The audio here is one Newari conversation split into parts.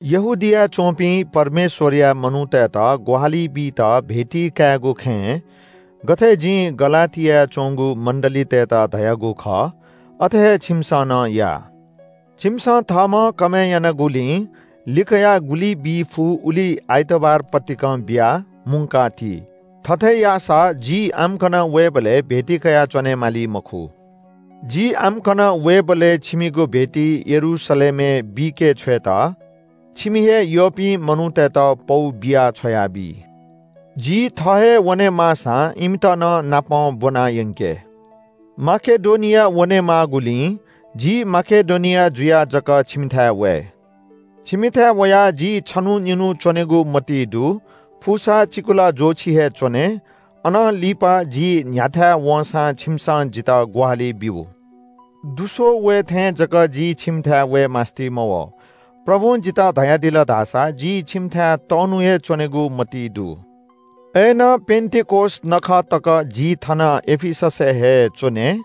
यहूदियाय् च्‍वंपिं परमेश्‍वरया मनूतय्‌त ग्‍वाहालि बीत भेटी कायेगु खँय् गथे जिं गलातियाय् च्‍वंगु मण्‍डलीतय्‌त धयागु खः अथे हे छिमिसं नं या। छिमिसं थःम्‍हं कमय् यानागुलिं लिकयाः गुलि बी फु उलि आइतबार पतिकं बियाः मुंका ति। थथे याःसा जि आम्‍कन वयेबलय् भेटी कयाच्‍वने माली मखु। जि आम्‍कन वयेबलय् छिमिगु भेटी यरूशलेमय् बीके छ्वयेत छिमि हे यःपिं मनूतय्‌त पौ बियाः छ्वयाबी। जि थः हे वनेमाःसां इमित नं नापं ब्‍वनायंके। माकेडोनिया वने माःगुलिं जि माकेडोनिया जुयाः जक छिमिथाय् वये। छिमिथाय् वयाः जि छन्‍हु निन्‍हु च्‍वनेगु मतिइ दु, फुसा चिकुला ज्‍वःछि हे च्‍वने। अनं लिपा जि न्‍ह्याथाय् वंसां छिमिसं जितः ग्‍वाहालि ब्‍यु। दुस्‍वः वये थें जक जि छिमिथाय् वये मास्‍ति मवः। प्रभुं जितः धयादिल धाःसा जि छिमिथाय् तःन्‍हु हे च्‍वनेगु मतिइ दु। अय्‌नं पेन्‍तिकोस नखः तक जि थन एफिससय् हे च्‍वने।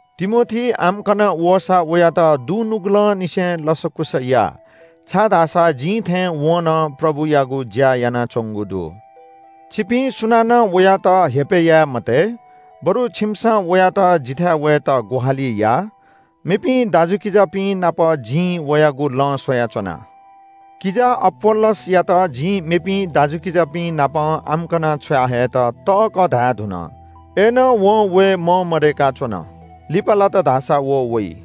तिमोथी आम्‍कन वःसा वयात दुनुगलंनिसें लसकुस या, छाय्‌धाःसा जिं थें वं नं प्रभुयागु ज्‍या यानाच्‍वंगु दु। छिपिं सुनानं वयात हेपय् याये मते, बरु छिमिसं वयात जिथाय् वयेत ग्‍वाहालि या। मेपिं दाजुकिजापिं नाप जिं वयागु लँ स्‍वयाच्‍वना। किजा अपोल्‍लोसयात जिं मेपिं दाजुकिजापिं नाप आम्‍कन छ्वयाहयेत तःकः धायेधुन, अय्‌नं वं वये मंमदय्‌का च्‍वन। लिपा लात धाःसा व वइ।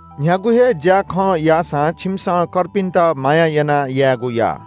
न्‍ह्यागु हे ज्‍याखँ याःसां छिमिसं कर्पिन्‍त माया यानाः यायेगु या।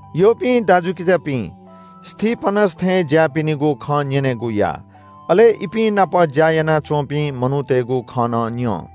यःपिं दाजुकिजापिं, स्‍तिफनस थें ज्‍याःपिनिगु खँ न्‍यनेगु या। अले इपिं नाप ज्‍या यानाच्‍वंपिं मनूतय्‌गु खँ नं न्‍यँ।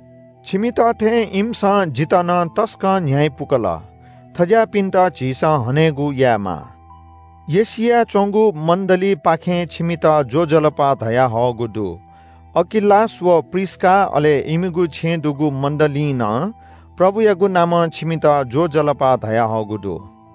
छिमित थें इमिसं जितः नं तसकं न्‍ह्यइपुकल। थज्‍याःपिन्‍त झीसं हनेगु यायेमाः। एशियाय् च्‍वंगु मण्‍डलीपाखें छिमित ज्‍वजलपा धयाहःगु दु। अकिलास व प्रिस्‍का अले इमिगु छेँय् दुगु मण्‍डलीं नं प्रभुयागु नामं छिमित ज्‍वजलपा धयाहःगु दु।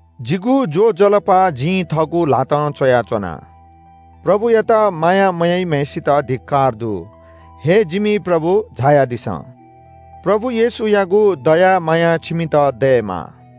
जिगु ज्‍वजलपा जिं थःगु ल्‍हातं च्‍वयाच्‍वना। प्रभुयात माया मयाइम्‍हय्‌सित धिक्‍कार दु। “हे जिमि प्रभु, झायादिसँ।” प्रभु येशूयागु दया माया छिमित दयेमा।